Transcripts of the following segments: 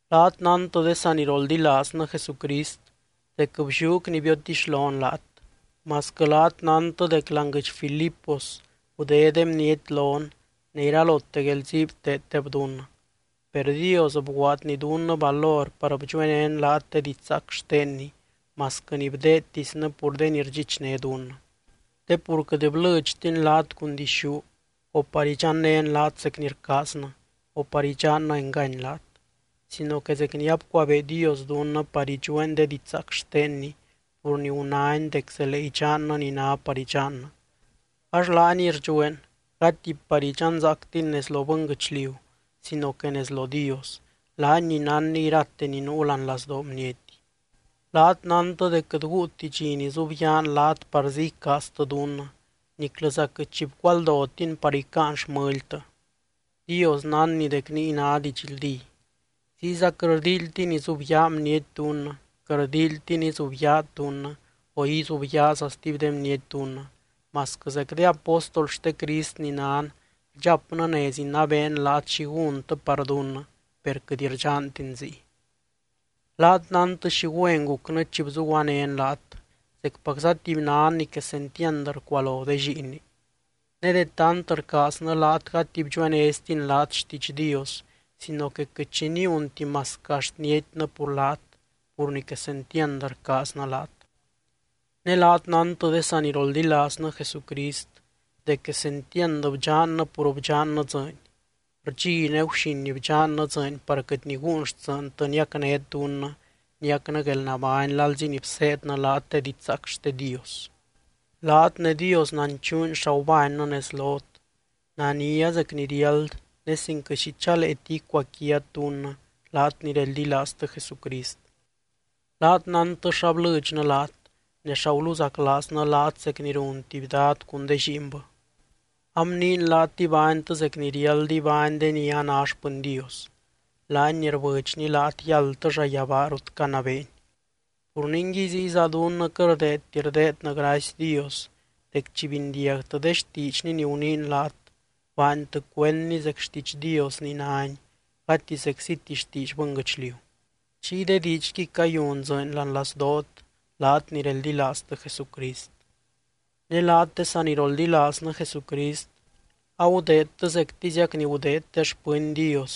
Laat nántɨ de saniroldilaaznɨ Jesucrist dec blliúc ni biotixlon laat, masquɨ laat nántɨ dec láani guɨdx Filipos gudé de bniety lon ne iralote guelzii bteeddeb dunnɨ. Per Dios bguaadny dunnɨ valor par bdxuenén laat de didxzaac xtenny, masquɨ ni bdeedtisnɨ pur de ni rdxichné dunnɨ. Te pur quɨt blɨdxtin laat cun dixú, o par idxannén laat zec ni rcaaznɨ, o par idxannɨ engany laat, sino que zec ni abcuabee Dios dunnɨ par idxueen de didxzaac xtenny pur ni gunány dec zelee idxannɨ ni ná par idxannɨ, ax laaniy rdxueen, gati par idxanzaactin nez lo bɨnguɨchliu sino que nez lo Dios, laany ni nánny irate ni nuu láani lazdoo bniety. Laat nántɨ dec quɨt guuti dxi nizubyaan laat parzí icaaztɨ dunnɨ, niclɨza quɨt xi bcualdotin par icáan xmɨltɨ. Dios nánny dec niy ná didxldí. Ziyza quɨt rldíilytin izubyaa bniety dunnɨ, quɨt rldíilytin izubyaat dunnɨ, o izubyaaza stuby de bniety dunnɨ, masquɨ zec de apóstol xte Crist ni nan rdxapnɨ nez inabeen laat xi gúntɨ par dunnɨ, per quɨt rdxantin ziy. Laat nántɨ xi güen gucnɨ chi bzuguanén laat, zecpacza tuby nan ni quesentiand rcualo de lliinni. Ne de tant rcaaznɨ laat gati bdxuenéztin laat xtiidx Dios sino que quɨt xi niunti masquɨ axt nietynɨ pur laat, pur ni quesentiand rcaaznɨ laat. Ne laat nántɨ de saniroldilaaznɨ Jesucrist dec quesentiand bdxannɨ pur bdxannɨ dzɨɨny. Rdxi ne guxin bdxannɨ dzɨɨny par quɨt niguun xtsɨɨntɨ niacnét dunnɨ niacnɨ guelnabány lalzi ni bseednɨ laat de didxzaac xte Dios. Laat ne Dios nanchuuny xa gubánnɨ nez lot, nania, zec ni riáld, ne sin quɨt xi chaleeti icuaquiat dunnɨ, laat ni reldilaaztɨ Jesucrist. Laat nántɨ xa blɨdxnɨ laat, ne xa guluzaclaaznɨ laat zec ni run tuby dad cun de lliinbɨ. Abniin laat ibánytɨ zec ni riáld ibány de ni a ná xpɨny Dios, laany ni rbɨdxny laat yáldtɨ llayabaa rut canabeeny. Pur ningui ziyza dunnɨ quɨt rdeedti rdeednɨ gracy Dios dec chi bindiagtɨ de xtiidxny ni guniin laat, baantɨ cuendni zec xtiidx Dios ni náni gati zecziti xtiidx bɨnguɨchliu. Chiy de diidxquiy cayun dzɨɨny láani lazdoot, laat ni reldilaaztɨ Jesucrist. Ne laat de saniroldilaaznɨ Jesucrist, agudeedtɨ zectiziac ni gudeed de xpɨny Dios,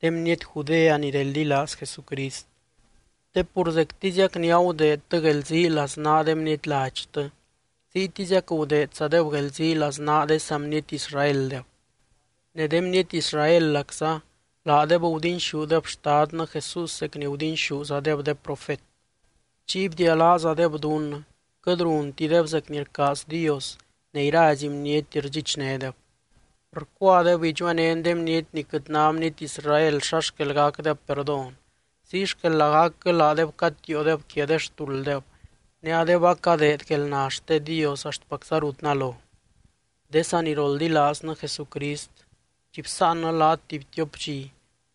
de bniety Judea ni reldilaaz Jesucrist. Te pur zectiziac ni agudeedtɨ guelzii laznaa de bniety ladxtɨ, ziytiziac gudeedzadeb guelzii laznaa de saa bniety Israeldeb. Ne de bniety Israelacza, laadeb gudinxúdeb Xtadnɨ Jesús zec ni gudinxúzadeb de profet. Chiy bdialáazadeb dunnɨ, quɨt runtideb zec ni rcaaz Dios ne irazy bniety rdxichnédeb. Rcuadeb idxuenén de bniety ni quɨt ná bniety Israel xa xquel gacdeb perdón, ziy xquel lagacquɨ laadeb catiiodeb quia de xtulddeb, ne adeb acadeed guelna xte Dios axtpacza rut nalo. De saniroldilaaznɨ Jesucrist, chi bsáannɨ laat tuby tiop dxi,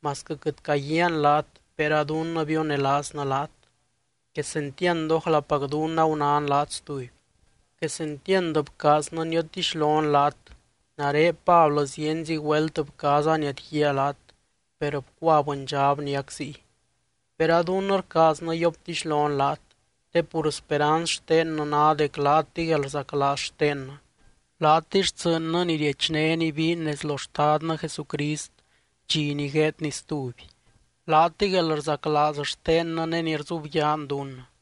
masquɨ quɨt caguiaan laat per a dunnɨ bionelaaznɨ laat, quesentiand ójlapac dunnɨ agunán laat stuby. Quesentiand bcaaznɨ niotixlon laat, nare Pablɨ zienzi güelt bcaaza niadguíaa laat, per bcua bɨndxab niac ziy. Per a dunnɨ rcaaznɨ yioptixlon laat, te pur speranz xtennɨ ná dec laatɨy guelrzaclaaz xtennɨ, laatɨy xtsɨɨnnɨ ni riechnén ibiin nez lo Xtadnɨ Jesucrist dxi ni gueedny stuby. Laatɨy guelrzaclaaz xtennɨ ne ni rzubyaan dunnɨ.